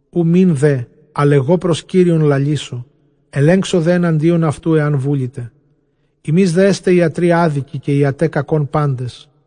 Οὐ μὴν δὲ ἀλλʼ ἐγὼ πρὸς Κύριον λαλήσω, ἐλέγξω δὲ ἐναντίον αὐτοῦ ἐὰν βούληται. Ὑμεῖς δὲ ἐστὲ ἰατροὶ ἄδικοι, καὶ ἰαταὶ κακῶν πάντες.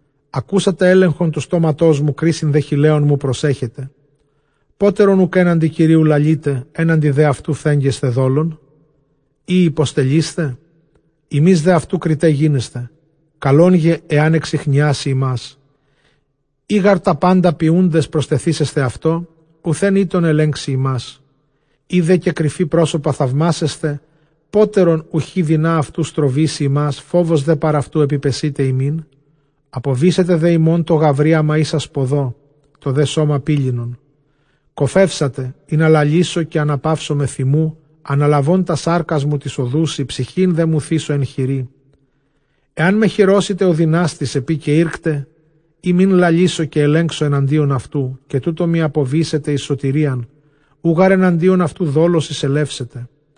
Ἀκούσατε δὲ ἔλεγχον τοῦ στόματός μου, κρίσιν δὲ χειλέων μου προσέχετε. Πότερον οὐκ ἔναντι Κυρίου λαλεῖτε, ἔναντι δὲ αὐτοῦ φθέγγεσθε δόλον; Ἢ ὑποστελεῖσθε; ὑμεῖς δὲ αὐτοὶ κριταὶ γίνεσθε. Καλὸν γὰρ ἐὰν ἐξιχνιάσῃ ὑμᾶς, εἰ γὰρ τὰ πάντα ποιοῦντες προστεθήσεσθε αὐτῷ, οὐθὲν ἧττον ἐλέγξει ὑμᾶς· εἰ δὲ καὶ κρυφῇ πρόσωπα θαυμάσεσθε, πότερον οὐχ ἡ δῖνα αὐτοῦ στροβήσει ὑμᾶς; ὁ φόβος δὲ παρʼ αὐτοῦ ἐπιπεσεῖται ὑμῖν, ἀποβήσεται δὲ ὑμῶν τὸ γαυρίαμα ἶσα σποδῷ, τὸ δὲ σῶμα πήλινον. Κωφεύσατε ἵνα λαλήσω, καὶ ἀναπαύσωμαι θυμοῦ, ἀναλαβὼν τὰς σάρκας μου τοῖς ὀδοῦσι, ψυχὴν δέ μου θήσω ἐν χειρί. Ἐάν με χειρώσηται ὁ δυνάστης, ἐπεὶ καὶ ἦρκται, ἦ μὴν λαλήσω καὶ ἐλέγξω ἐναντίον αὐτοῦ· Καὶ τοῦτό μοι ἀποβήσεται εἰς σωτηρίαν, οὐ γὰρ ἐναντίον αὐτοῦ δόλος εἰσελεύσεται.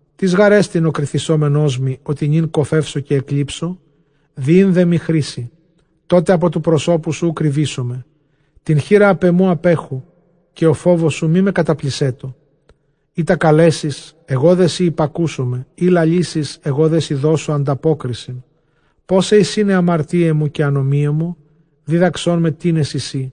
Τίς γάρ ἐστιν ὁ κριθησόμενός μοι, ὅτι νῦν κωφεύσω καὶ ἐκλείψω; Δυεῖν δέ μοι χρήσῃ, τότε ἀπὸ τοῦ προσώπου σου οὐ κρυβήσομαι. Τὴν χεῖρα ἀπʼ ἐμοῦ ἀπέχου, καὶ ὁ φόβος σου μή με καταπλησσέτω. Εἶτα καλέσεις, ἐγὼ δέ σοι ὑπακούσομαι, ἢ λαλήσεις, ἐγὼ δέ σοι δώσω ἀνταπόκρισιν· Πόσαι εἰσὶν αἱ ἁμαρτίαι μου καὶ ἀνομίαι μου; δίδαξόν με τίνες εἰσί.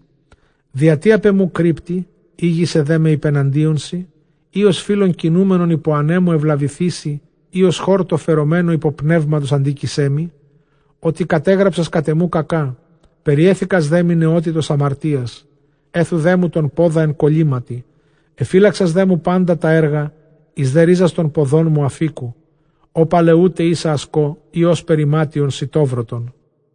Διατί ἀπʼ ἐμοῦ κρύπτῃ, ἥγησαι δέ με ὑπεναντίον σοι; Ἢ ὡς φῦλλον κινούμενον ὑπὸ ἀνέμου εὐλαβηθήσῃ, ἢ ὡς χόρτῳ φερομένῳ ὑπὸ πνεύματος ἀντίκεισαί μοι; Ὅτι κατέγραψας κατʼ ἐμοῦ κακὰ, περιέθηκας δέ μοι νεότητος ἁμαρτίας. Ἔθου δέ μου τὸν πόδα ἐν κωλύματι, ἐφύλαξας δέ μου πάντα τὰ ἔργα, εἰς δὲ ῥίζας τῶν ποδῶν μου ἀφίκου. Ὃ παλαιοῦται ἶσα ἀσκῷ, ἢ ὥσπερ ἱμάτιον σητόβρωτον.